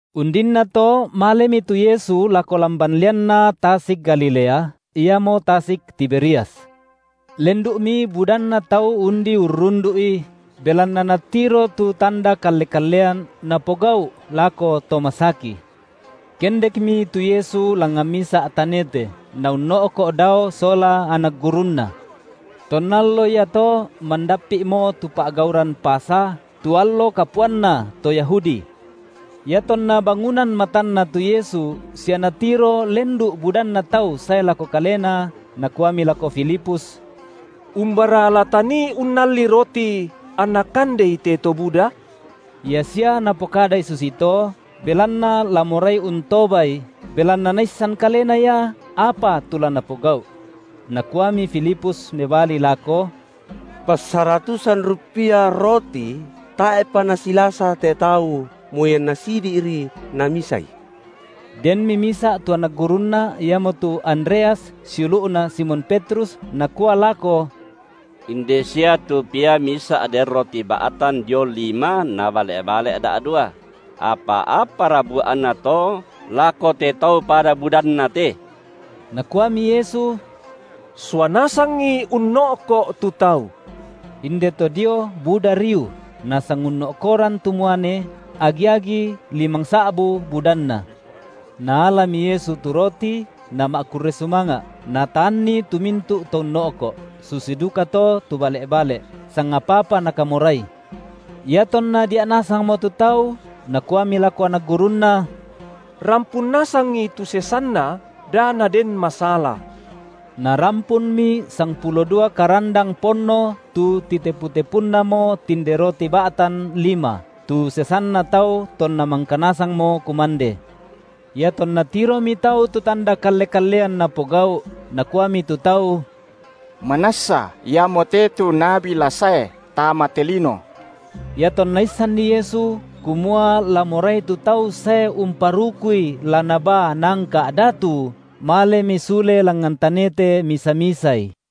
Undinnato malemi tu Yesu lako lamban lianna tasik Galilea, iamo tasik Tiberias. Lendu’mi budanna tau undi urrundu’I, belanna natiro tu tanda kalle-kallean Napogau’ lako to masaki. Kendekmi tu Yesu langngan misa’ tanete, Naunno’ko’ dao sola anak gurunNa. Tonna iato mandappi’mo tu pa’gauran Pasa, tu allo kapuanna to Yahudi. Iatonna bangunan matanNa tu Yesu sia Natiro lendu’ budanna tau sae lako Kalena, Nakuami lako Filipus: Umbara la tanii unnalli roti, anna kandei te to buda? Ia sia Napokadai susito, belanna la morai untobai, belanna Naissan kalena Ia apa tu la Napogau’. Nakuami Filipus mebali lako: Passaratusan ruppia roti tae’pa nasilasa te tau, moi anna sisidi’ri namisai. Denmi misa’ tu anak gurunNa iamotu Andreas siulu’na Simon Petrus, nakua lako: Inde sia tu pia misa’ den roti ba’tan dio lima na bale’-bale’ da’dua; apa apara bua’na to lako te tau pada budanna te? Nakuami Yesu: Sua nasangi unno’ko’ tu tau. Indeto dio buda riu; nasangunno’koran tu muane, agi-agi limangsa’bu budanna. Naalami Yesu tu roti, Nama’kurre sumanga’, Nataanni tu mintu’ to unno’ko’, susi dukato tu bale’-bale’, sangapa-apa nakamorai. Iatonna dia’ nasangmo tu tau, Nakuami lako anak gurunNa: Rampun nasangi tu sesanna, da naden masala. Narampunmi sangpulo dua karandang ponno tu titepu-tepunnamo tinde roti ba’tan lima, tu sesanna tau tonna mangka nasangmo kumande. Iatonna tiromi tau tu tanda kalle-kallean Napogau’, nakuami tu tau: Manassa Iamote tu nabi la sae tama te lino. Iatonna issanni Yesu kumua la morai tu tau sae umparukuI la nabaa naangka’ datu, malemi sule langngan tanete misa-misaI.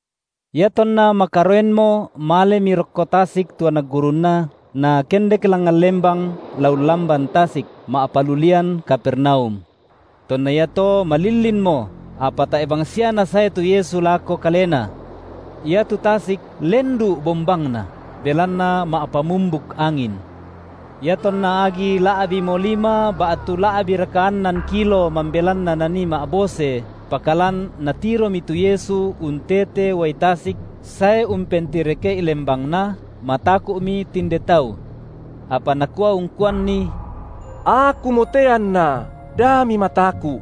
Iatonna makaroenmo malemi rokko tasik tu anak gurunNa, nakendek langngan lembang la ullamban tasik, ma’palulian Kapernaum. Tonna iato malillinmo, apa tae’ bangsia Nasae tu Yesu lako kalena. Iatu tasik lendu’ bombangna, belanna ma’pamumbuk angin. Iatonna agi la’bimo lima ba’tu la’biraka annan kilo mambelanna nanii ma’bose, pakalan natiromi tu Yesu untete uai tasik sae umpentireke’i lembangna, mataku’mi tinde tau. Apa Nakua ungkuanni: Akumote anna da mimataku’.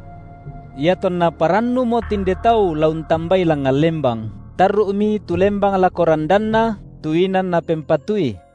Iatonna parannumo tinde tau la untambai langngan lembang, tarru’mi tu lembang lako radanna, tu inan napempatui.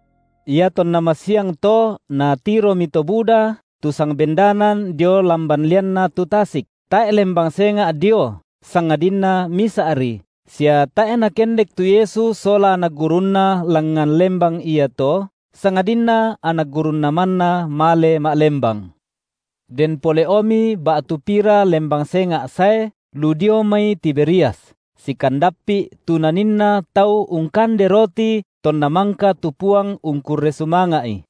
Iatonna masiangto natiromi to buda, tu sangbendanan dio lamban lianna tu tasik, tae’ lembang senga’ dio sangadinna misa’ri, sia tae’ Nakendek tu Yesu sola anak gurunNa langngan lembang iato, sangadinna anak gurunNa manna male ma’lembang. Den pole’omi ba’tu pira lembang senga’ sae lu dio mai Tiberias, sikandappi’ tu naninna tau ungkande roti tonna mangka tu Puang ungkurre sumanga’i.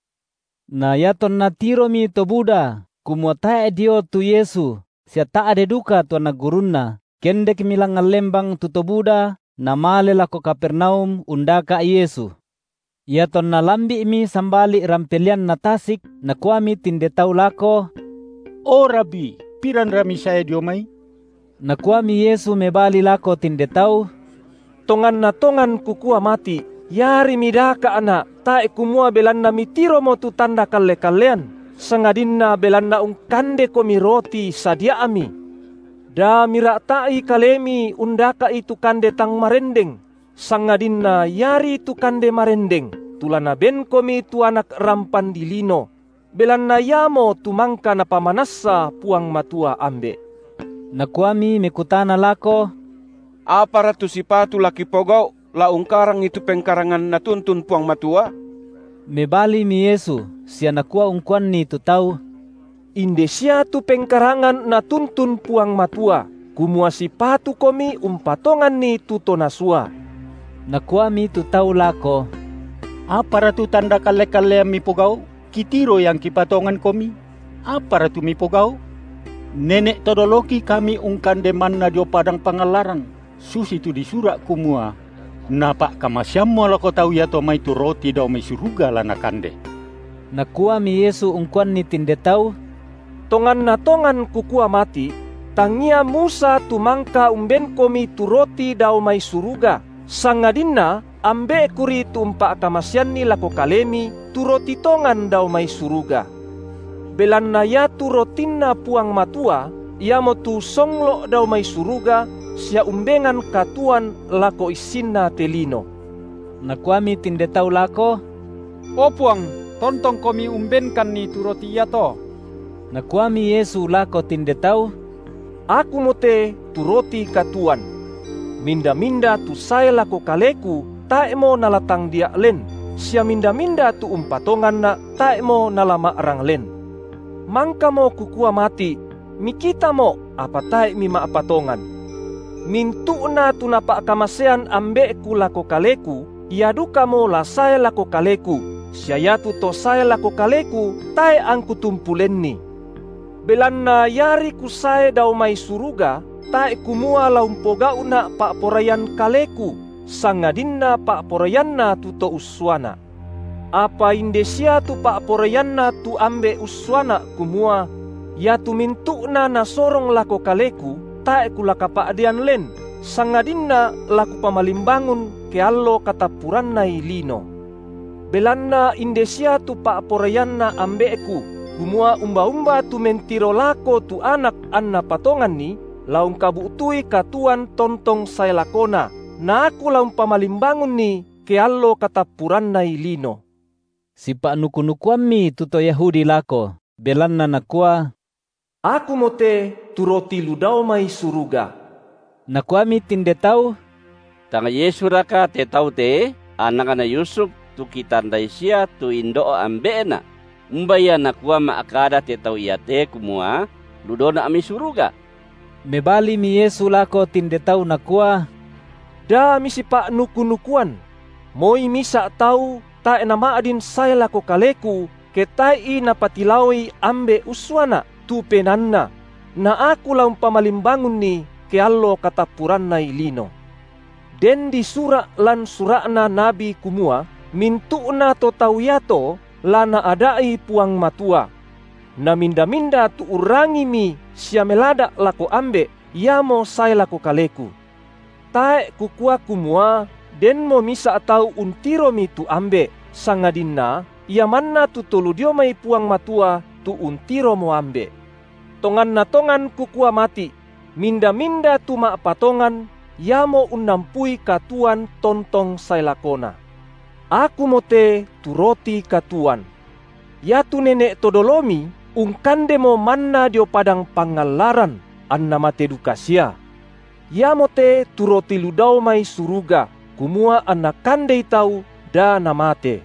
Na iatonna tiromi to buda kumua tae’ dio tu Yesu sia ta’de duka tu anak gurunNa, kendekmi langngan lembang tu to buda, namale lako Kapernaum undaka’ Yesu. Iatonna lambi’mi sambali’ rampe lianna tasik, nakuami tinde tau lako: O Rabi, piranra Misae dio mai? Nakuami Yesu mebali lako tinde tau: Tonganna tongan Kukua mati’, iari midaka’Na’ tae’ kumua belanna mitiromo tu tanda kalle-kallean, sangadinna belanna ungkandekomi roti sadia’mi. Da mira’ta’i kalemi undaka’i tu kande tang marendeng, sangadinna iari tu kande marendeng, tu la Nabenkomi tu Anak rampan dilino; belanna Iamotu mangka Napamanassa Puang Matua Ambe’. Nakuami mekutana lako: Apara tu sipatu la kipogau’ la ungkarangi tu pengkarangan Natuntun Puang Matua? Mebalimi Yesu sia Nakua ungkuanni tu tau: Inde sia tu pengkarangan Natuntun Puang Matua, kumua sipatukomi umpatonganNi tu To Nasua. Nakuami tu tau lako: Apara tu tanda kalle-kallean Mipogau’, kitiroi angki patonganKomi? Apara tu Mipogau’? Nene’ to doloki kami ungkande manna dio padang pangallaran, susitu disura’ kumua: Napa’kamaseammo lako tau iato mai tu roti dao mai suruga la nakande. Nakuami Yesu ungkuanni tinde tau: Tonganna tongan Kukua mati’: Tangia Musa tu mangka umbenkomi tu roti dao mai suruga, sangadinna Ambe’Kuri tu umpa’kamaseanni lako kalemi tu roti tongan dao mai suruga. Belanna Ia tu rotinNa Puang Matua Iamotu songlo’ dao mai suruga sia umbengan katuoan lako issinna te lino. Nakuami tinde tau lako: O Puang, tontongKomi umbenkanni tu roti iato. Nakuami Yesu lako tinde tau: Akumote tu roti katuoan. Minda-minda tu sae lako Kaleku, tae’mo nala tangdia’ len, sia minda-minda tu umpatonganNa’, tae’mo nala ma’rang len. Mangkamo Kukua mati’: MikitaMo’, apa tae’ mima’patongan. Mintu’na tu Napa’kamasean Ambe’Ku lako Kaleku, ia dukamo la sae lako Kaleku, sia iatu to sae lako Kaleku, tae’ angKu tumpu lenni. Belanna iari Kusae dao mai suruga, tae’ kumua la umpogau’Na’ pa’poraian Kaleku, sangadinna pa’poraianNa tu To ussuaNa’. Apa inde sia tu pa’poraianNa tu Ambe’ ussuaNa’ kumua: iatu mintu’na Nasorong lako Kaleku, tae’ Kula kapa’dean len, sangadinna la Kupamalimbangun ke allo katappurannai lino. Belanna inde sia tu pa’poraianNa Ambe’ku, kumua umba-umba tu mentiro lako tu Anak anna patonganNi, la ungkabu’tui katuoan tontong sae lakona, na Aku la umpamalimbangunni ke allo katappurannai lino. Sipa’nuku-nukuammi tu to Yahudi lako, belanna Nakua: Akumote tu roti lu dao mai suruga. Nakuami tinde tau: Tang Yesuraka te Tau te, anakna Yusuf, tu kitandai sia tu indo’ ambe’Na? Umba ia nakua Nama’kada te Tau iate kumua: Lu daoNa’ mai suruga? Mebalimi Yesu lako tinde tau Nakua: Da misipa’nuku-nukuan! Moi misa’ tau tae’ nama’din sae lako Kaleku, ke tae’i Napatilaoi Ambe’ ussuaNa’, tu penaanna; na Aku la umpamalimbangunni ke allo katappurannai lino. Den disura’ lan sura’na nabi kumua: Mintu’na to tau iato la Naada’i Puang Matua. Na minda-minda tu urrangimi sia melada’ lako Ambe’, iamo sae lako Kaleku. Tae’ kukua kumua, denmo misa’ tau untiromi tu Ambe’, sangadinna Ia manna tu To lu dio mai Puang Matua tu untiromo Ambe’. Tonganna tongan Kukua mati’: Minda-minda tu ma’patongan, iamo unnampui katuoan tontong sae lakona. Akumote tu roti katuoan. Iatu nene’ to dolomi ungkandemo manna dio padang pangallaran, anna mate duka sia. Iamote tu roti lu dao mai suruga, kumua anna kandei tau da namate.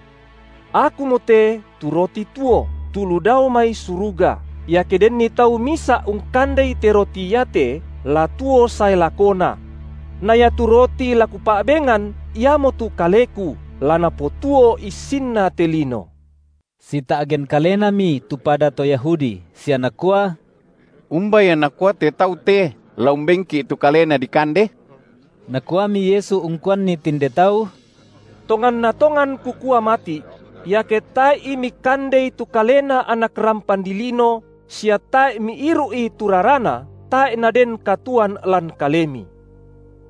Akumote tu roti tuo, tu lu dao mai suruga; iake denni tau misa’ ungkandei te roti iate, la tuo sae lakona; na iatu roti la Kupa’bengan iamotu kaleKu, la napotuo issinna te lino. Sita’gen kalenami tu pada to Yahudi sia nakua: Umba Ia Nakua te Tau te la umbenki’ tu kaleNa dikande? Nakuami Yesu ungkuanni tinde tau: Tonganna tongan Kukua mati’: iake tae’i mikandei tu kaleNa Anak rampan dilino sia tae’ miiru’i tu raraNa, tae’ naden katuoan lan kalemi.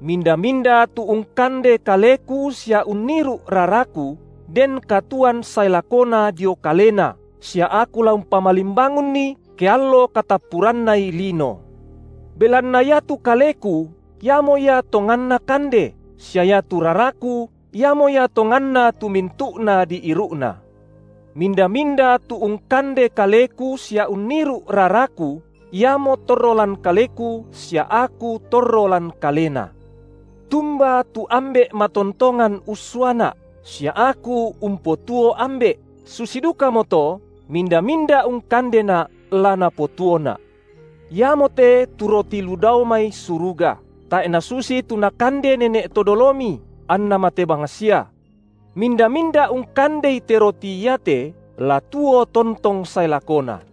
Minda-minda tu ungkande kaleKu sia unniru’ raraKu, den katuoan sae lakona dio kalena, sia Aku la umpamalimbangunni ke allo katappurannai lino. Belanna iatu kaleKu iamo ia tonganna kande, sia iatu raraKu iamo ia tonganna tu mintu’na diiru’na. Minda-minda tu ungkande kaleKu sia unniru’ raraKu, iamo torro lan Kaleku sia Aku torro lan kalena. Tumba tu Ambe’ matontongan ussuaNa’, sia Aku umpotuo Ambe’, susi dukamoto minda-minda ungkandeNa’ la napotuoNa’. Iamote tu roti lu dao mai suruga, tae’ nasusi tu nakande nene’ to dolomi, anna mate bangsia. Minda-minda ungkandei te roti iate, la tuo tontong sae lakona.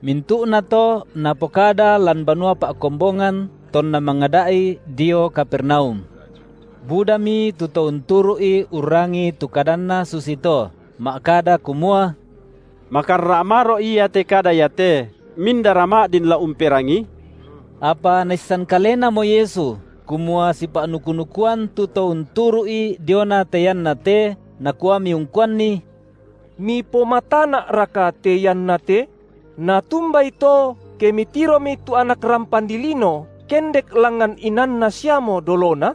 Mintu’na to Napokada lan banua pa’kombongan, tonna mangada’i dio Kapernaum. Budami tu to unturu’I urrangii tu kadanNa susito, ma’kada kumua: Makarra’ maro’ ia te kada iate, mindara ma’din la umperangii? Apa Naissan Kalenamo Yesu, kumua sipa’nuku-nukuan tu to unturu’I diona te ianna te, Nakuami ungkuanni: Mipomatana’raka te iannate? Natumbai to ke mitiromi tu Anak rampan dilino kendek langngan inanNa siamo dolona?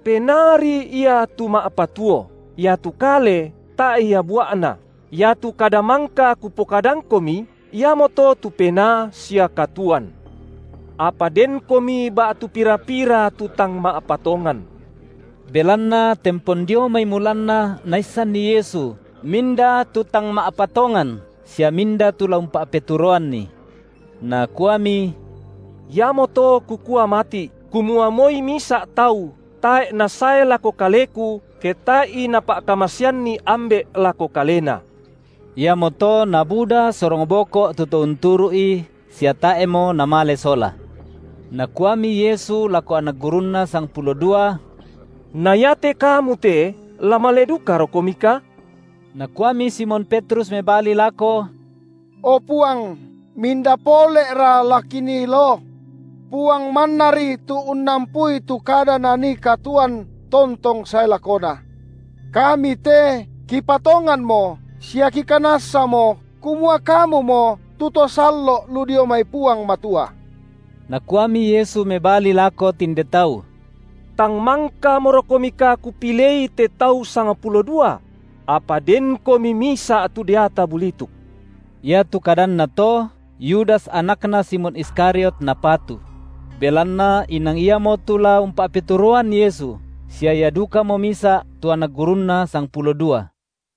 Penaari ia tu ma’patuo, iatu kale tae’ ia bua’na. Iatu kada mangka Kupokadangkomi, iamoto tu penaa sia katuoan. Apa denkomi ba’tu pira-pira tu tang ma’patongan. Belanna tempon dio mai mulanna Naissanni Yesu minda tu tang ma’patongan sia minda tu la umpa’peturoanNi. Nakuami: Iamoto Kukua mati’, kumua moi misa’ tau tae’ nasae lako Kaleku, ke tae’i Napa’kamaseanni Ambe’ lako kalena. Iamoto nabuda sorong boko’ tu to unturu’I, sia tae’mo namale sola. Nakuami Yesu lako anak gurunNa sangpulo dua: Na iate kamu te la male dukarokomika? Nakuami Simon Petrus mebali lako: O Puang, minda pole’ra la kinii loo? Puang mannari tu unnampui tu kada nanii katuoan tontong sae lakona. Kami te kipatonganmo sia kikanassamo kumua Kamumo tu To Sallo’ lu dio mai Puang Matua. Nakuami Yesu mebali lako tinde tau: Tang mangkamorokomika Kupilei te tau sangpulo dua? Apa denkomi misa’ tu deata bulituk. Iatu kadanNa to, Yudas anakna Simon Iskariot napatu: belanna inang iamotu la umpa’peturoan Yesu sia ia dukamo misa’ tu anak gurunNa sangpulo dua.